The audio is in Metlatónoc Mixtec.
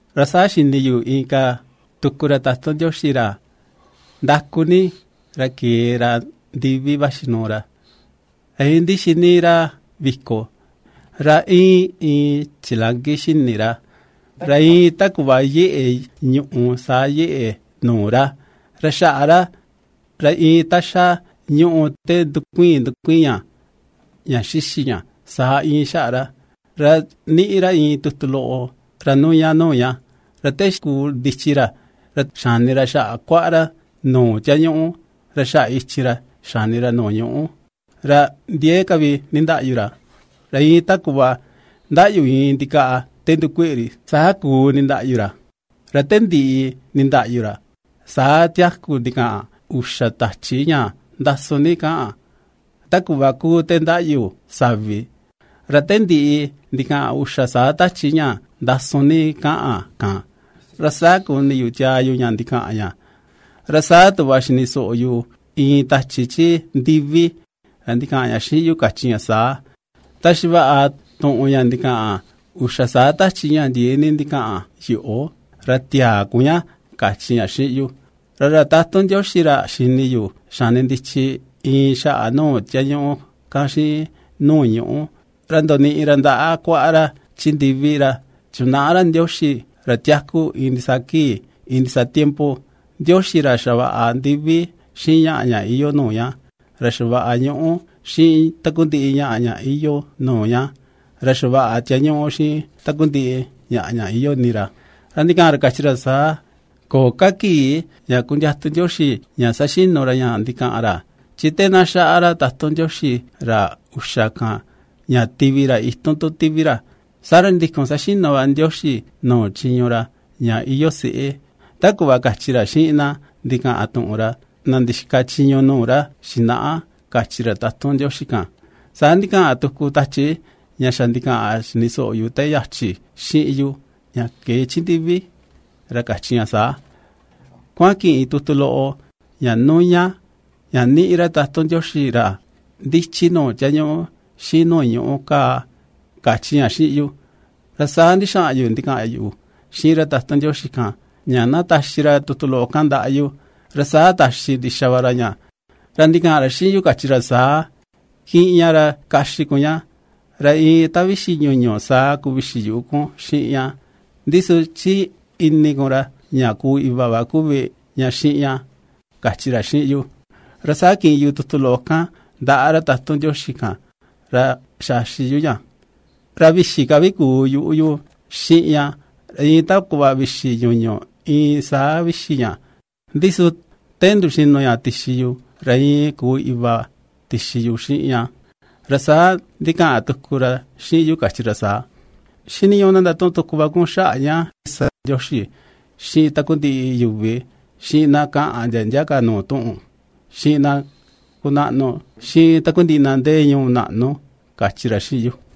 Ra saa xini yu inka tuku ra tatun Ndioxi, ra ndaku ni, ra kee ra ndivi vaxi nuu ra, ra iin ndixi níí ra viko, ra íin iin chilanki xini ra, ra iin ta kuꞌva yeꞌe ñuꞌù saa yeꞌe nuu ra; ra xaꞌa ra, ra iin ta xa ñùꞌù te iin ndukuiin ndukuiin ña, ña xixi ña, saa íin xaꞌa ra. Ra ^niꞌi ra iin tutu loꞌo ra nuña nuu ña, ra te xiku ndichi ra, ra xani ra xaꞌa kuaꞌa ra nuu tiañuꞌu, ra xaꞌa ichin ra xani ra nuu ñuꞌú. Ra ndiee ka vi nindaꞌyu ra, iin ta kuꞌva ndaꞌyu iin ndikaꞌa te ndukueꞌe ri, saa kuu nindaꞌyu ra. Ra te ndiꞌi nindaꞌyu ra, saa tiaku ndikaꞌan uxa tachi ña ndasun ní kaꞌan, ta kuꞌva kuu te ndaꞌyu savi. Ra te ndiꞌi ndikaꞌan uxa saa tachi ña ndasun ni kaꞌan kan, ra saa kuni yu tiaa yu ña ndikaꞌan ña, ra saa tuꞌva xini soꞌo yu iin tachi chi ndivi, ra ndikaꞌan ña xiꞌin yu kachi ña saa: ―Taxi vaꞌa tuꞌun ña ndikaꞌan uxa saa tachi, ña ndiee ni ndikaꞌan yoꞌo, ra tiäa kun ña ―kachi ña xiꞌin yu. Ra ra tatun Ndioxi ra xini yu xani ndichi iin xaꞌa nuu tiañuꞌu kan, xiꞌin nuu ñuꞌu, ra ndoniꞌi ra ndaꞌa kuaꞌa ra chi ndivi. Ra chinaꞌa ra Ndioxi ra tiaku iin ndisaa kii, iin ndisaa tiempo, Ndioxi ra xavaꞌa ndivi xiꞌin ñaꞌa ña iyoo nuu ña, ra xavaꞌa ñuꞌú xiꞌin takundiꞌi ñaꞌa ña iyoo nuu ña, ra xavaꞌa tiañuꞌu xiꞌin takundiꞌi ñaꞌa ña iyoo ini ra, ra ndikaꞌan ra kachi ra saa: ―Köo ka kii ña kundiatu Ndioxi ña saxinu ra ña ndikaꞌan ra, chi te na xaꞌa ra tatun Ndioxi ra uxa kan, ña tivi ra, itun tu tivi ra, saa ra ndikun saxinu va Ndioxi nuu chiñu ra, ña iyoo se̱ꞌè, ta kuꞌva kachi ra xiꞌin na ndikaꞌan tuꞌun ra, na ndixika chiñu nuu ra xinaꞌa ―kachi ra tatun Ndioxi kan. Saa ndikaꞌan tuku tachi, ña xa ndikaꞌan xini soꞌo yu te yachi xiꞌin yu, ña kee chi ndivi, ra kachi ña saa: ―Kuaꞌan kiꞌin tutu loꞌo, ña nuña, ña ^niꞌi ra tatun Ndioxi ra ndichi nuu tiañuꞌu xiꞌin nuu ñuꞌú kaa ―kachi ña xiꞌin yu. Ra saa ndixaꞌan yu ndikaꞌan yu xiꞌin ra tatun Ndioxi kan, ña na taxi ra tutu loꞌo kan ndaꞌa yu, ra saa taxi ndixa va ra ña, ra ndikaꞌan ra xiꞌin yu kachi ra saa: ―Kiꞌin ña ra kaxi kun ña, ra iin ta vixi ñuñu saa kuu vixi yuꞌu kun xiꞌin ña, ndi su chi ini kun ra ña kuu iva va kuvi ña xiꞌin ña ―kachi ra xiꞌin yu. Ra saa kiꞌin yu tutu loꞌo kan ndaꞌa ra tatun Ndioxi kan, ra xaxi yu ña, ra vixi ka vi kuu yuꞌu yu xiꞌin ña, iin ta kuꞌva vixi ñuñu iin saa vixi ña, ndi su te nduxinu ña tixi yu, ra iin kuu iva tixi yu xiꞌin ña. Ra saa ndikaꞌan tuku ra xiꞌin yu kachi ra saa: ―Xiniñuꞌu na ndatuꞌun tuku va kun xaꞌa ña sa Ndioxi xiꞌin takundiꞌi yuvi, xiꞌin na kaꞌan ndia ndia ka nuu tuꞌun, xiꞌin na kunaꞌnu, xiꞌin takundiꞌi na ndee ñuu naꞌnu ―kachi ra xiꞌin yu.